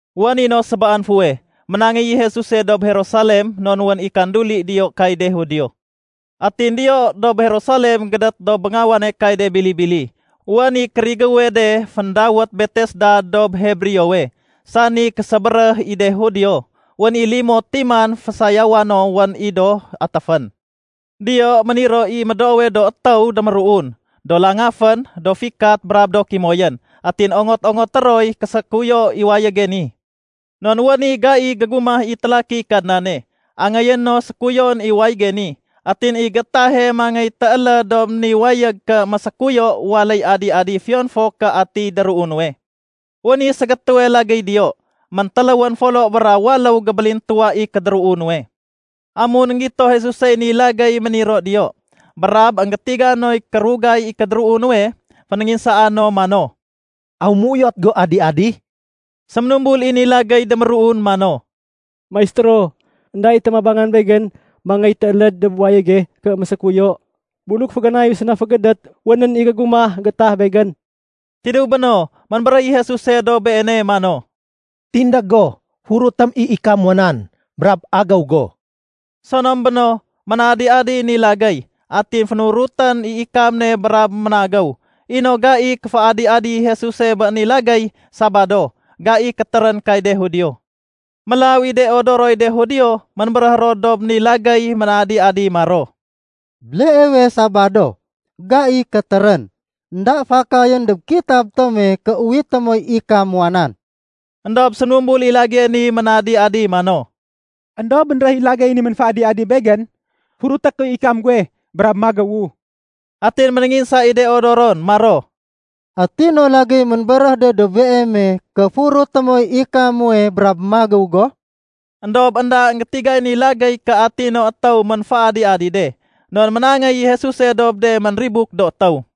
Wén i no sébaan fuweh, ménangéy i Jesuse dob Jerusalem non wén i kanduli diyo kay de Judio. Atin diyo dob Jerusalem gédét dob béngawane kay de bili-bili, wén i kérigéwe de féndawét Betesda dob Hebreowe, sani késébéréh i de Judio. Wén i limo timan fésayawa no wén i do atéfén. Diyo méniro i médoowe do étéw déméruun, do langafén, do fikat, brab do kimoyén. Atin ongot-ongoté roy késékuyo i wayége ni. Non wén i gai gégumah i télakiy Kadnane, angéyé no sékuyoén i wayége ni. Atin i géétahe mangéy tééléd dob ni wayég ké mésékuyo, waléy adi-adi fiyon fo ké atiy déruu nuwe. Wén i ségétéwe lagéy diyo, méntéléwén folo bra waléw gébélintuwa i kédéruu nuwe. Amun énggito Jesusey ni lagéy méniro diyo brab énggétiga noy kérugay i kédéruu nuwe, fénénginsaa no mano, “Aw méuyot go adi-adi?” Séménumbul i ni lagéy déméruun mano, “Maistéro, énda i témabangan begén mangéy tééléd dob wayége ké mésékuyo. Buluk féganayu séna fégédét, wénén i gégumah gétah begén.” Tidéw béno, ménbéréh i Jesuse dob beene mano, “Tindég go, furutém i ikam muwa nan, brab agéw go.” Sonom béno, ménadi-adiy ni lagéy. Atin fénurutén i ikam ne brab ménagéw. I no gai kéféadi-adi Jesuse bé ni lagéy Sabado, gai kétérén kay de Judio. Mélaw i de odoroy de Judio ménbéréh ro dob ni lagéy ménadi-adi maro, “Béleewe Sabado, gai kétérén. Enda fakayén dob kitab tome ké uwité moy ikam muwa nan.” Endob séménumbul i lagéyé ni ménadi-adi mano, “Endob bénréh i lagéye ni ménféadi-adi begén, furuté kuy ikam guwe brab magéwu.” Atin ménénginsa i de odoron maro, “Ati no lagéy ménbéréh de dob beeme, ké furuté moy ikam muwe brab magéw go?” Endob énda énggétigay ni lagéy ké ati no étéw ménféadi-adi de, non ménangéy i Jesuse dob de ménribuk do étéw.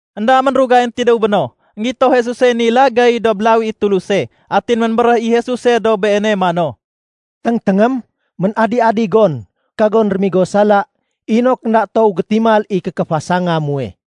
Enda ménrugayén tidéw béno, énggito Jesusey ni lagéy dob lawi i Tuluse. Atin ménbéréh i Jesuse dob beene mano, “Téngténgém, ménadi-adi gon. Kagon rémigo sala inok énda toow gétimal i kékéfasanga muwe.”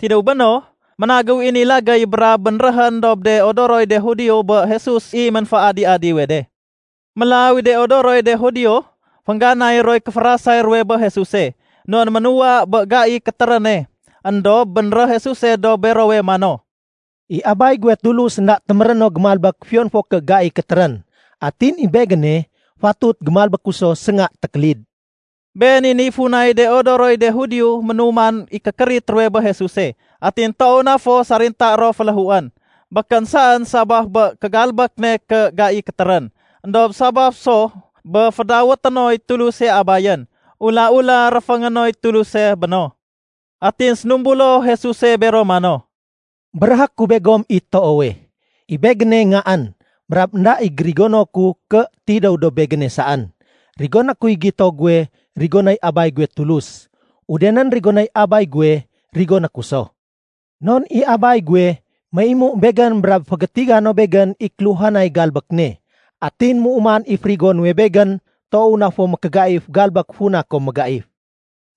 Tidéw béno, ménagéw i ni lagéy brab bénréhén dob de odoroy de Judio bé Jesus i ménféadi-adiwe de. Mélaw i de odoroy de Judio, féngganay roy kéférasay ruwe bé Jesuse, non ménuwa bé gai kétéréne. Endob bénréh Jesuse dob berowe mano, “I Abay guwe Tulus énda téméréno gémalbék fiyon fo ké gai kétérén, atin i Begéne fatut gémalbéku so sénga tékélid.” Been i niy funay de odoroy de Judio ménuman i kékérit ruwe bé Jesuse, atin toow na fo sarintaé ro féléhuén. Békén saén sabaf bé kégalbék ne ké gai kétérén, éndob sabaf so bé fédawété noy Tuluse Abayén, ula-ula réféngé noy Tuluse béno. Atin sénumbulo Jesuse bero mano, “Béréhé ku begom i toowe, i Begéne Ngaén, brab énda i gérigono ku ké tidéw dob Begéne saén. Rigoné kuy gito guwe rigonéy Abay guwe Tulus. Udenén rigonéy Abay guwe, rigoné ku so. Non i Abay guwe méimu Begén brab fégétiga no Begén i kéluhanay galbék ne. Atin méuman i férigo nuwe Begén toow na fo mékégaif galbék funa kom mégaif.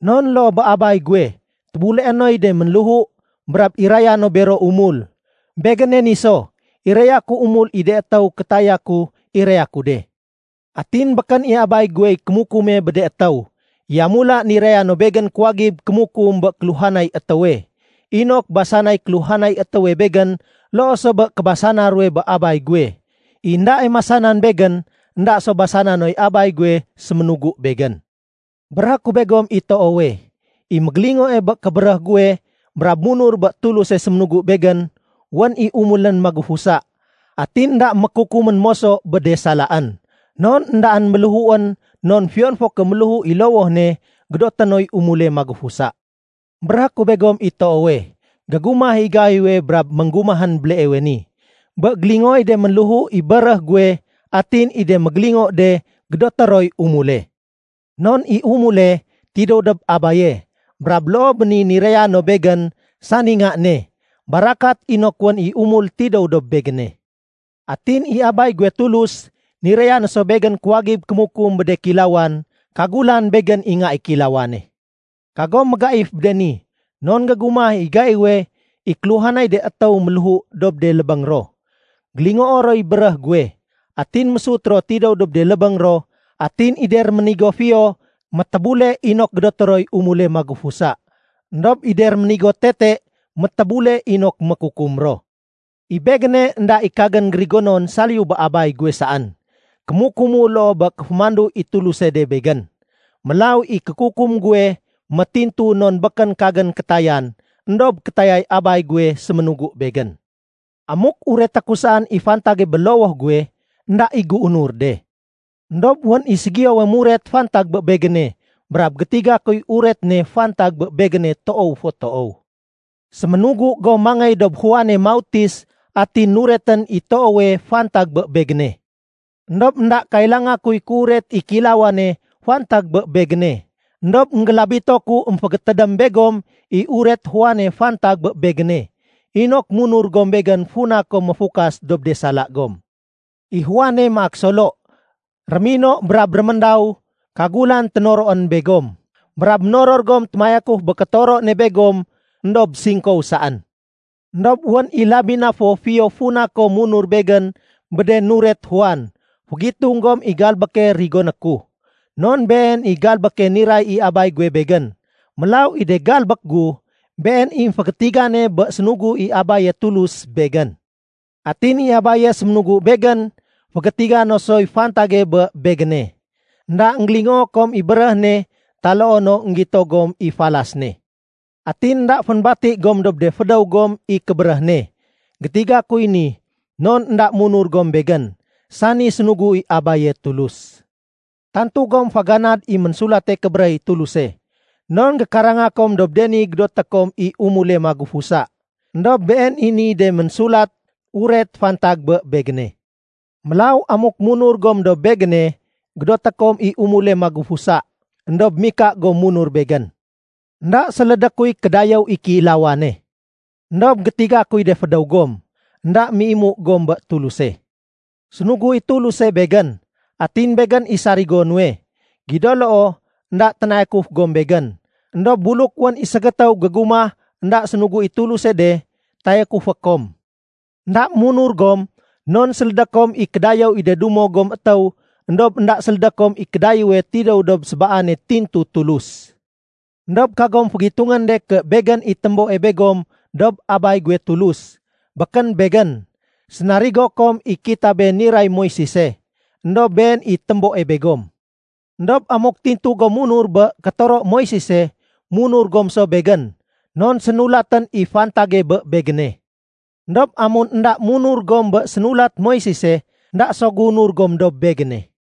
Non loo bé Abay guwe tébuleé noy de ménléhu brab iraya no bero umul, Begéne ni so, iraya ku umul i de étéw kétaya ku iraya ku de. Atin békén i Abay guwey kémukume bé de étéw. Yamula niraya no Begén kuwagib kémukum bé kéluhanay étéwe, inok basanay kéluhanay étéwe Begén loo so bé kébasana ruwe bé Abay guwe. I éndae masanan Begén, énda so basana noy Abay guwe séménugu Begén. “Béréhé ku begom i toowe, i mégélingoe bé kébéréh guwe brab munur bé Tuluse séménugu Begén, wén i umulén magufusa. Atin énda mékukumén moso bé de salaén. Non éndaén méléhuén non fiyon fo ké méléhu i lowoh ne, gédoté noy umule magufusa. Béréhé ku begom i toowe, gégumah i gaiwe brab ménggumahén béleewe ni, bé gélingooy de ménléhu i béréh guwe, atin i de mégélingo de, gédoté roy umule. Non i umule tidéw dob Abaye, brab loo bé ni niraya no Begén, sani Nga ne, barakat inok wén i umul tidéw dob Begéne. Atin i Abay guwe Tulus, niraya no so Begén kuwagib kémukum bé de kéilawan kagulan Begén i Nga i Kéilawane. Kagom mégaif bé de ni, non gégumah i gaiwe i kéluhanay de étéw ménléhu dob de lébéng ro, gélingoo roy béréh guwe. Atin mésut ro tidéw dob de lébéng ro, atin i de réménigo fiyo métébule inok gédoté roy umule magufusa. Endob i de réménigo tete métébule inok mékukum ro. “I Begéne, énda i kagén gérigonon saliyu bé Abay guwe saén. Kémukumu loo bé kéfémandu i Tuluse de Begén. Mélaw i kékukum guwe métintu non békén kagén kétayan éndob kétayay Abay guwe séménugu Begén. “Amuk ureté ku saén i fantage bé lowoh guwe, énda i géunur de. Endob wén i ségiyowe muret fantag bé Begéne brab gétiga kuy uret ne fantag bé Begéne toow fo toow. Séménugu gom mangéy dob Juane Mautis atin nuretén i toowe fantag bé Begéne. Endob énda kailanga kuy kéuret i kéilawane fantag bé Begéne, éndob énggélabito ku émfégétédém begom i uret Juane fantag bé Begéne, inok munur gom Begén funa kom méfukas dob de sala gom. I Juane maak solo, mérino brab réméndaw kagulan ténoroén begom, brab ménoror gom témayakuf bé kétoro ne begom éndob singkow saén. Endob wén i labi na fo fiyo funa kom munur Begén bé de nuret Juan. Fégitung gom i galbéke rigoné ku, non been i galbéke niray i Abay guwe Begén. Mélaw i de galbék gu, been i émfégétigane bé sénugu i Abaye Tulus Begén. Atin i Abaye séménugu Begén, fégétiga no soy fantage bé Begéne. Enda énggélingoo kom i béréh ne taloo no énggito gom i falas ne. Atin énda fénbati gom dob de fédéw gom i kébéréh ne. Gétiga kuy ni non énda munur gom Begén, sani sénugu i Abaye Tulus. Tantu gom féganad i Ménsulate Kébéréh i Tuluse, non gékaranga kom dob de ni gédoté kom i umule magufusa. Endob been i niy de ménsulat uret fantag bé Begéne. Mélaw amuk munur gom dob Begéne, gédoté kom i umule magufusa, éndob mika gom munur Begén. “Enda sélédé kuy kédayéw i kéilawane. Endob gétiga kuy de fédéw gom, énda méimu gom bé Tuluse. Sénugu i Tuluse Begén, atin Begén i sarigo nuwe. Gido loo énda ténayakuf gom Begén. Endob buluk wén i ségétéw gégumah énda sénugu i Tuluse de, tayakufé kom. Enda munur gom non sélédé kom i kédayéw i de dumo gom étéw éndob énda sélédé kom i kédayéwe tidéw dob sébaane tintu Tulus. Endob kagom fégitungén de ké Begén i témboe begom dob Abay guwe Tulus. Békén Begén. Sénarigo kom i kitabé niray Moisese, éndob been i téméboe begom. Endob amuk tintu gom munur bé kétoro Moisese, munur gom so Begén, non sénulatén i fantage bé Begéne. Endob amun énda munur gom bé sénulat Moisese, énda so géunur gom dob Begéne.”